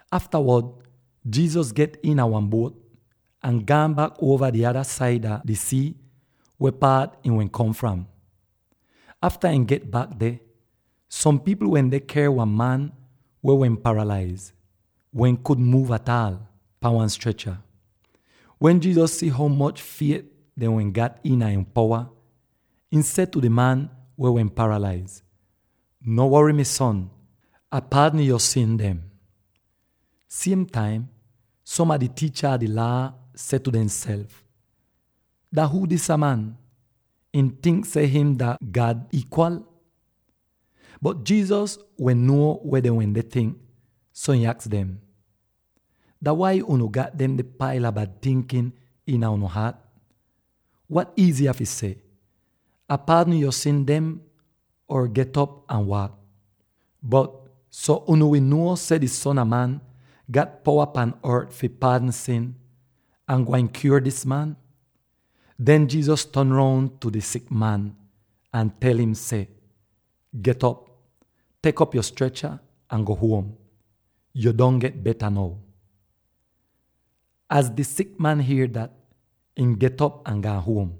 Aftawod Jesus get iina wan buot, ahn gaan bak uova di ada saida di sii weh paat ihn wehn kom fram. Afta ihn get bak deh, som pipl wende ker wan man weh wehn paralaiz —weh kudn muuv ataal— pahn wan strecha. Wen Jesus si ho moch fiet dehn wehn gat iina ihn powa, ihn seh tu di man weh wehn paralaiz, “No wory, mi son, Ah paadn yo sin dem.” Siem taim som a di tiicha a di Laa seh tu demself, “Dah huu disa man; ihn tink seh him dah God iikwal?” Bot Jesus wehn nuo weh dehn wende tink, so ihn aks dem, “Dah wai unu gat demde paila bad tinkin iina unu haat? Wat iiziya fi seh: ‘Ah paadn yo sin dem,’ or ‘Get'op ahn waak?’ Bot so unu wi nuo seh di Son a Man gat powa pan ort fi paadn sin, Ah gwain kyuor dis man.” Den Jesus ton roun tu di sik man, ahn tel im seh, “Get'op, tek op yo strecha, ahn go huom; yu don get beta now.” Az di sik man hier dat, ihn get'op ahn gaan huom!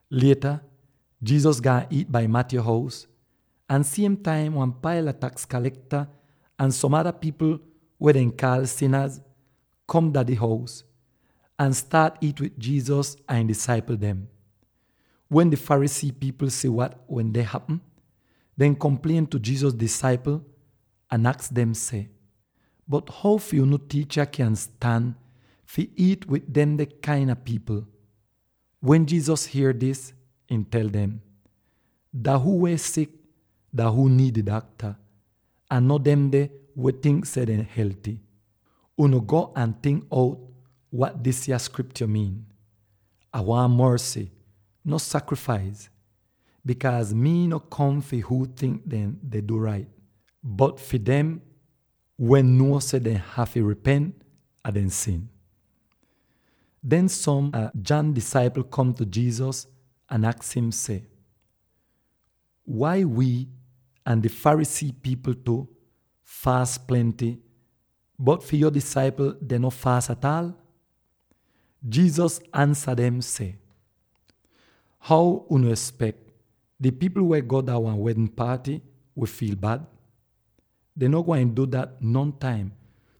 Lieta Jesus gaan iit dah Matthew hous, ahn siem taim wan paila taks kalekta ahn som ada pipl weh dehn kaal “sinaz” kom dah di hous, ahn staat iit wid Jesus ahn ihn disaipl dem. Wen di Pharisee pipl si wat wende hapm, dehn komplien tu Jesus disaipl ahn aks dem seh, “Bot how fi unu tiicha kyan stan fi iit wid demde kain a pipl?” Wen Jesus hier dis, ihn tel dem, “Dah huu weh sik, dah huu niid di dakta; ahn no demde weh tink seh dehn helty. Unu go ahn tink out wat disya Skriptyo miin, ‘Ah waahn morsy, no sakrifais,’ bikaaz mii no kom fi huu tink dehn deh du rait, bot fi dem weh nuo seh dehn hafy ripent a dehn sin.” Den som a John disaipl kom tu Jesus ahn aks im seh, “Wai wii —ahn di Pharisee pipl tu— faas plenty, bot fi yo disaipl dehn no faas ataal?” Jesus ansa dem seh, “How unu espek di pipl weh go dah wan wedn paaty fi fiil bad? Dehn no gwain du dat nontaim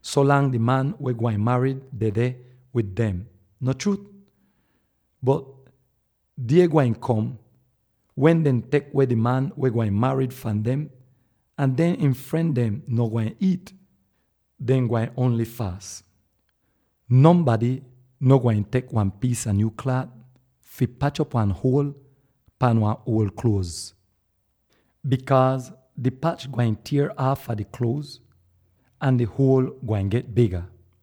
so langs di man weh gwain marid dedeh wid dem, no chruut? Bot di die gwain kom wen dehn tek weh di man weh gwain marid fahn dem, ahn den ihn fren dem no gwain iit; dehn gwain ongl faas. “Nonbady no gwain tek wan piis a nyuu klaat fi pach op wan huol pahn wan uol kluoz, bikaaz di pach gwain tier aafa di kluoz, ahn di huol gwain get biga.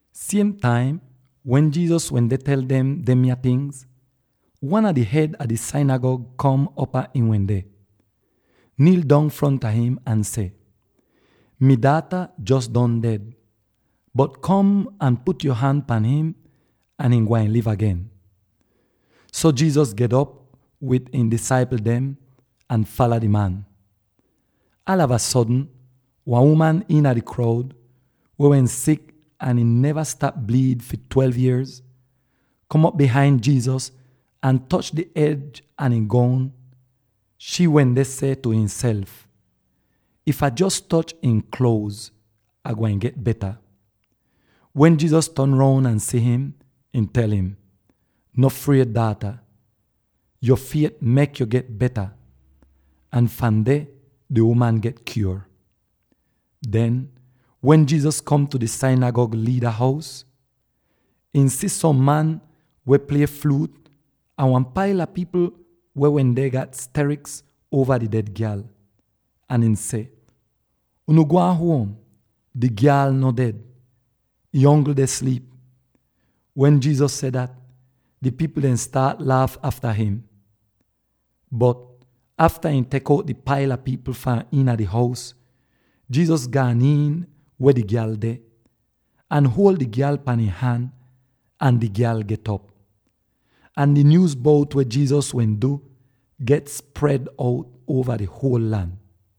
Siem taim wen Jesus wende tel dem demya tingz, wan a di hed a di sinigag kom upaa ihn wende, niil dong fronta im, ahn seh, “Mi daata jos don ded, bot kom ahn put yo han pahn im, ahn ihn gwain liv agen.” So Jesus get'op wid ihn disaipl dem, ahn fala di man. Aalava sodn wan uman iina di kroud —weh wehn sik ahn ihn neva stap bliid fi twelve yierz— kom op bihain Jesus ahn toch di ej a ihn goun. Shii wende seh tu ihnself, “If Ah jos toch ihn kluoz, Ah gwain get beta.” Wen Jesus ton roun ahn si'im, ihn tel im, “No fried, daata! Yo fiet mek yo get beta.” Ahn fahn deh, di uman get kyuor. Den, wen Jesus kom tu di sinigag liida hous, ihn si som man weh plie fluut, ahn wan paila pipl weh wende gat steriks uova di ded gyal; ahn ihn seh, “Unu gwaan huom! Di gyal no ded; ihn ongl deh sliip.” Wen Jesus seh dat, di pipl dehn staat laaf afta him. Bot afta ihn tek out di paila pipl fahn iina di hous, Jesus gaan iin weh di gyal deh, ahn huol di gyal pahn ihn han, ahn di gyal get'op! Ahn di nyuuz bout weh Jesus wehn du get spred out uova di huol lan.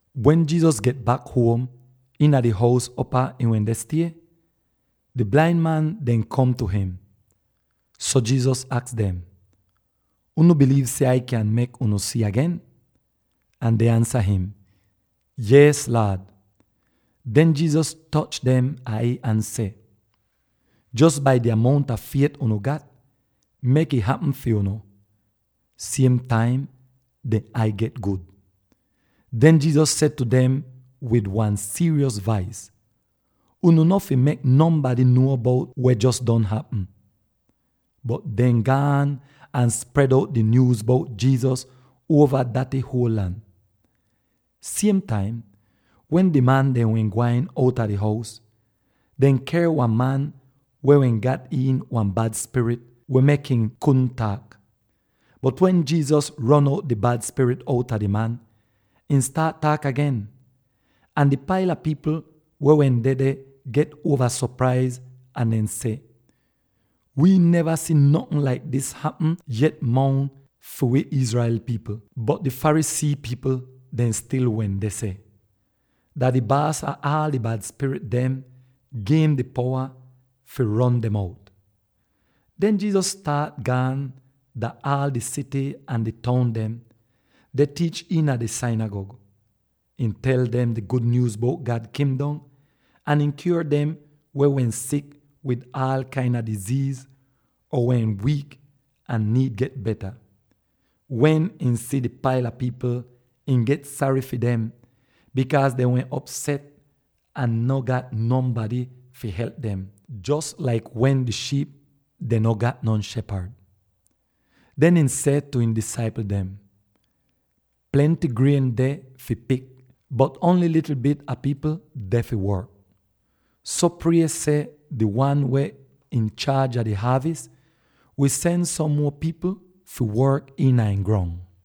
Wen Jesus get bak huom iina di hous upaa ihn wende stie, di blain man dehn kom tu im. So Jesus aks dem, “Unu biliiv seh Ah kyan mek unu si agen?” Ahn dehn ansa im, “Yees, Laad!” Den Jesus toch dehn ai ahn seh, “Jos bai di amount a fiet unu gat, mek'ih hapm fi unu.” Siem taim dehn ai get gud! Den, Jesus seh tu dem wid wan siiryos vais, “Unu no fi mek nonbady nuo bout weh jos don hapm.” Bot dehn gaan ahn spred out di nyuuz bout Jesus uova daty huol lan. Siem taim wen di man dem wehn gwain outa di hous, dehn ker wan man weh wehn gat iin wan bad spirit weh mek im kudn taak. Bot wen Jesus ron out di bad spirit outa di man, ihn staat taak agen! Ahn di paila pipl weh wehn dedeh get uova sopraiz ahn dehn seh, “Wii neva si notn laik dis hapm yet mongs fi wi Israel pipl!” Bot di Pharisee pipl dem stil wende seh, “Dah di baas ah aal di bad spirit dem gi'im di powa fi ron dem out.” Den Jesus staat gaan dah aal di sity ahn di toun dem, deh tiich iina dehn sinigag. Ihn tel dem di gud nyuuz bout God Kingdom, ahn ihn kyuor dem weh wehn sik wid aal kain a diziiz, or wehn wiik ahn niid get beta. Wen ihn si di paila pipl, ihn get sary fi dem, bikaaz dehn wehn opset ahn no gat nonbady fi help dem, jos laik wen di shiip dehn no gat non shepad. Den ihn seh tu ihn disaipl dem, “Plenty grien deh fi pik, bot ongl likl bit a pipl deh fi work. So prie seh di Wan weh inchaaj a di haavis wi sen som muo pipl fi work iina ihn grong.”